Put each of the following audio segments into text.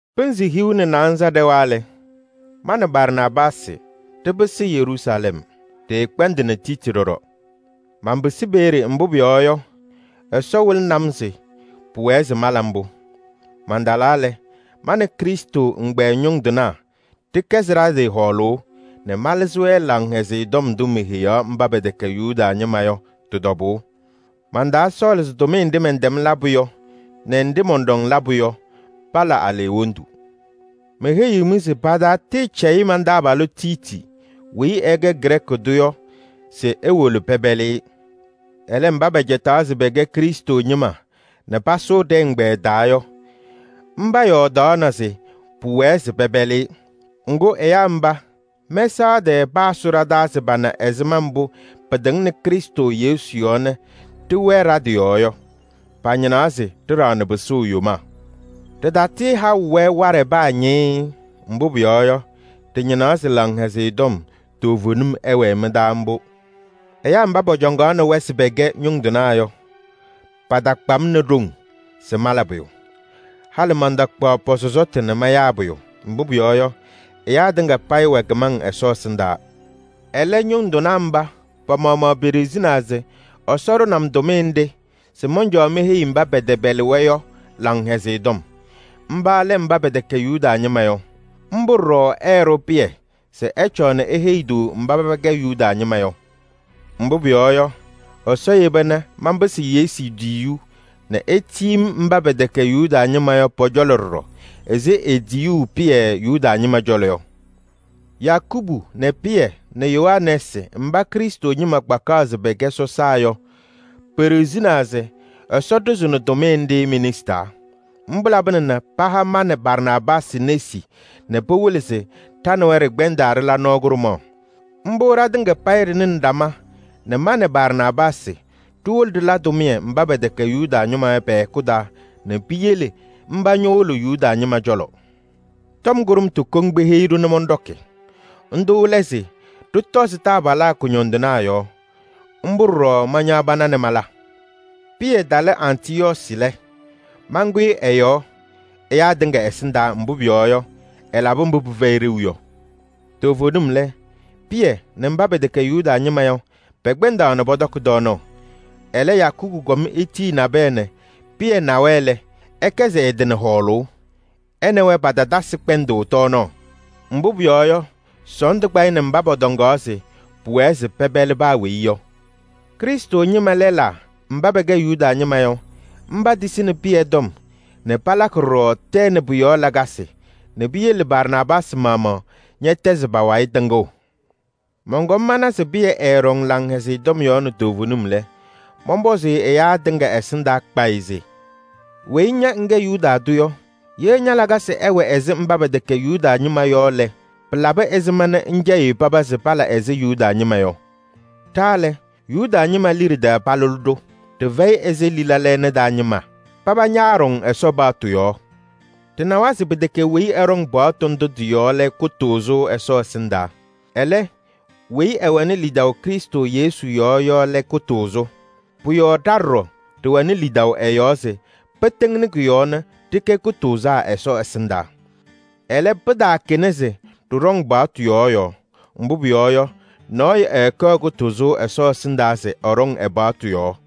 Pɩnzɩ hiu nɛ naanza ɖɛwa lɛ, ma nɛ Barnaabaasɩ ɖɩpɩsɩ Yeruusalɛm. Ɖɩɩkpɛndɩnɩ Tiiti ɖɔɖɔ. Manpɩsɩ peeye, mbʋ pʋyɔɔ yɔ, Ɛsɔ wɩlɩnɩ-m se pʋwɛ se mala mbʋ. Mantalaa lɛ, ma nɛ Krɩstʋ ɛgbɛyɛ ñʋŋ tɩnaa ɖɩkɛzɩ ɖa-tɩ hɔɔlʋʋ nɛ malɩzɩ-wɛ Laŋhɛzɩyɛ Tɔm ndʋ meheyaɣ mba pɛtɛkɛ Yuda ñɩma yɔ, tɩ-tɔbʋʋ. Mantaasɔɔlɩ se tʋmɩyɛ nɖɩ mɛntɛm labʋ yɔ nɛ nɖɩ mɔnɖɔŋ labʋ yɔ pala aleɣwondu. Meheyiɣ-mɩ se paataatɩɩcɛyɩ man-taabalʋ Tiiti weyi ɛkɛ Grɛɛkɩ tʋ yɔ se ewolo pɛpɛlɩ-ɩ. Ɛlɛ, mba pɛcɛtaɣ se pɛkɛ Krɩstʋ ñɩma nɛ paasʋ ɖɛ-ɛgbɛyɛ taa yɔ, mba yɔɔdaɣna se pʋwɛɛ se pɛpɛlɩ-ɩ. Ŋgʋ, ɛyaa mba, mɛsaɣ tɛɛ paasʋ ɖa-taa se pana ɛzɩma mbʋ pɩtɩŋnɩ Krɩstʋ Yesu yɔɔ nɛ ɖɩwɛɛ ɖa-tɩ yɔɔ yɔ. Pañɩnaɣ se ɖɩɖaɣnɩ pɩsʋʋ yomaa. Ɖɩtatɩɩhaʋ-wɛ waɖɛ paa ñɩɩɩ. Mbʋ pʋyɔɔ yɔ, ɖɩñɩnaɣ se Laŋhɛzɩyɛ Tɔm toovenim ɛwɛɛ mɩ-taa mbʋ. Ɛyaa mba pɔcɔŋaɣnɩ-wɛ se pɛkɛ ñʋŋ tɩnaa yɔ, patakpa-m nɛ ɖoŋ se mala pʋyʋ. Halɩ mantakpaɣ pɔ-sɔsɔtʋ nɛ mayaa pʋyʋ. Mbʋ pʋyɔɔ yɔ, ɛyaa tɩŋa payɩ wɛ kɩmaŋ Ɛsɔ ɛsɩndaa. Ɛlɛ, ñʋŋ tɩnaa mba pa-maɣmaɣ peɖiɣzinaa se Ɛsɔ ɖʋnɩ-m tʋmɩyɛ nɖɩ se mɔncɔɔ meheyi kɩtɛpɛlɩŋ Laŋhɛzɩyɛ Tɔm: mba lɛ mba pɛtɛkɛ Yuda ñɩma yɔ. Mbʋ ɖɔɖɔ ɛɛɖʋ Pɩyɛ se ɛcɔɔ nɛ eheyi-tʋ mba paba kɛ Yuda ñɩma yɔ. Mbʋ pʋyɔɔ yɔ, Ɛsɔ yeba nɛ manpɩsɩ Yesu tiyiyu nɛ etiyi-m mba pɛtɛkɛ Yuda ñɩma yɔ pɔ-cɔlɔ ɖɔɖɔ ɛzɩ etiyuu Pɩyɛ Yuda ñɩma cɔlɔ yɔ. Yakubu nɛ Pɩyɛ nɛ Yohanɛɛsɩ mba Krɩstʋ ñɩma kpakaɣ se pɛkɛ sɔsaa yɔ, peɖiɣzinaa se Ɛsɔ ɖʋzɩnɩ tʋmɩyɛ nɖɩ me-nesi taa. Mbʋ labɩna nɛ paha ma nɛ Barnaabaasɩ nesi nɛ pɩwɩlɩ se ɖa nɛ wɛ ɖɩkpɛndaa ɖɩla nɔɔ kʋɖʋmaɣ. Mbʋ ɖatɩŋa ɖɩnɩnɩ ɖama nɛ ma nɛ Barnaabaasɩ ɖiwolo ɖɩla tʋmɩyɛ mba pɛtɛkɛ Yuda ñɩma yɔ pɛ-hɛkʋ taa nɛ piyele mba ñowolo Yuda ñɩma cɔlɔ. Tɔm kʋɖʋmtʋ koŋ peheyi-ɖʋ nɛ mɔnɖɔkɩ. Ndʋ lɛ se ɖɩtɔzɩ taabalaa kʋñɔndɩnaa yɔɔ. Mbʋ ɖɔɖɔ mañaɣ pana nɛ mala. Pɩyɛ talɩ Antɩyɔɔsɩ lɛ, mankʋyɩ ɛ-yɔɔ ɛyaa tɩŋa ɛsɩndaa, mbʋ pʋyɔɔ yɔ, ɛlabɩ mbʋ pɩfɛyɩ ɖeu yɔ. Toovenim lɛ, Pɩyɛ nɛ mba pɛtɛkɛ Yuda ñɩma yɔ, pɛkpɛndaɣ nɛ pɔtɔkɩ tɔɔnaɣ. Ɛlɛ, Yakubu kɔm etiyi nabɛyɛ nɛ Pɩyɛ na-wɛ lɛ, ɛkɛzɩ ɛ-tɩ nɛ hɔɔlʋʋ. Ɛ nɛ wɛ patatasɩ kpɛndʋʋ tɔɔnaɣ, mbʋ pʋyɔɔ yɔ, sɔɔndʋ kpa-ɩ nɛ mba pɔtɔŋaɣ se pɩwɛɛ se pɛpɛlɩ paa weyi yɔ. Krɩstʋ ñɩma lɛlaa mba pɛkɛ Yuda ñɩma yɔ, petisini Pɩyɛ nɛ palakɩ ɖɔɖɔ tɛɛ nɛ pʋ-yɔɔ lakasɩ nɛ piyele Barnaabaasɩ maɣmaɣ ñɛtɛzɩ pa-wayɩ tɩŋʋʋ. Mɔnkɔm mana se Pɩyɛ ɛɛɖɔŋ Laŋhɛzɩyɛ Tɔm yɔɔ nɛ toovenim lɛ, mɔnpɔzɩ-ɩ ɛyaa tɩŋa ɛsɩndaa kpayɩ se: “Weyi ña ŋkɛ Yuda tʋ yɔ, ye ña-lakasɩ ɛwɛ ɛzɩ mba pɛtɛkɛ Yuda ñɩma yɔ lɛ, pɩlabɩ ɛzɩma nɛ ŋcɛyɩɣ paba se pala ɛzɩ Yuda ñɩma yɔ?” Ɖa lɛ, Yuda ñɩma liɖe taa palʋlɩ-ɖʋ. Ɖɩfɛyɩ ɛzɩ lila lɛɛna taa ñɩma. Paba ñaaɖɔŋ Ɛsɔ paɣtʋ yɔɔ. Ɖɩnawa se pɩtɛkɛ weyi ɛɖɔŋ paɣtʋ ndʋ tɩ-yɔɔ yɔ lɛ kʋtʋʋzʋ Ɛsɔ ɛsɩndaa. Ɛlɛ, weyi ɛwɛnɩ lidaʋ Krɩstʋ Yesu yɔɔ yɔ lɛ kʋtʋʋzʋ. Pʋ-yɔɔ ɖa ɖɔɖɔ ɖɩwɛnɩ lidaʋ ɛ-yɔɔ se pɩtɩŋnɩ kʋ-yɔɔ nɛ ɖɩkɛ kʋtʋʋzaa Ɛsɔ ɛsɩndaa. Ɛlɛ, pɩtaakɛna se ɖɩɖɔŋ paɣtʋ yɔɔ yɔɔ. Mbʋ pʋyɔɔ yɔ, nɔɔyʋ ɛɛkɛɣ kʋtʋʋzʋ Ɛsɔ ɛsɩndaa se ɛɖɔŋ ɛ-paɣtʋ yɔɔ.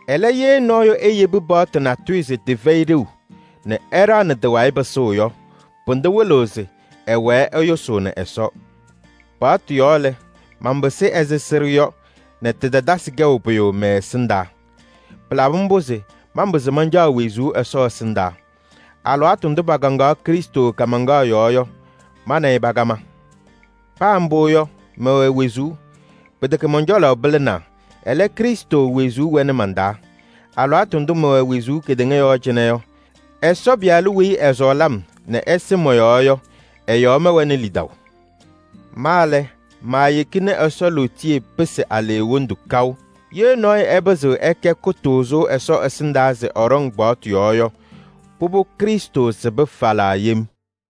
Ɛlɛ, ye nɔɔyʋ eyebi paɣtʋ natʋyʋ se tɩfɛyɩ ɖeu nɛ ɛɖaɣnɩ tɩ-wayɩ pɩsʋʋ yɔ, pʋdʋ wɩlɩɣ se ɛwɛɛ ɛyʋsʋʋnɩ Ɛsɔ. Paɣtʋ yɔɔ lɛ, manpɩsɩ ɛzɩ sɩɖʋ yɔ nɛ tɩtatasɩ kɛʋ pʋyʋ mɛ-ɛsɩndaa. Pɩlabɩ mbʋ se manpɩzɩ mancaɣ wezuu Ɛsɔ ɛsɩndaa. Alɩwaatʋ ndʋ pakaŋaɣ Krɩstʋ kaamaŋkaɣ yɔɔ yɔ, ma nɛ ɩ pakama. Paa mbʋ yɔ, mɛwɛ wezuu. Pɩtɛkɛ mɔn-cɔlɔ pɩlɩnaa, ɛlɛ, Krɩstʋ wezuu wɛnɩ man-taa. Alɩwaatʋ ndʋ mɛwɛ wezuu kedeŋa yɔɔ cɩnɛ yɔ, Ɛsɔ Pɩyalʋ weyi ɛsɔɔlɩ-m nɛ ɛsɩ mɔ-yɔɔ yɔ ɛ-yɔɔ mɛwɛnɩ lidaʋ. Ma lɛ, maayeki nɛ Ɛsɔ lootiye pɩsɩ aleɣwondu kaʋ. Ye nɔɔyʋ ɛpɩzɩɣ ɛkɛ kʋtʋʋzʋ Ɛsɔ ɛsɩndaa se ɛɖɔŋ paɣtʋ yɔɔ yɔ, pʋbʋ Krɩstʋ sɩbɩ falaa yem.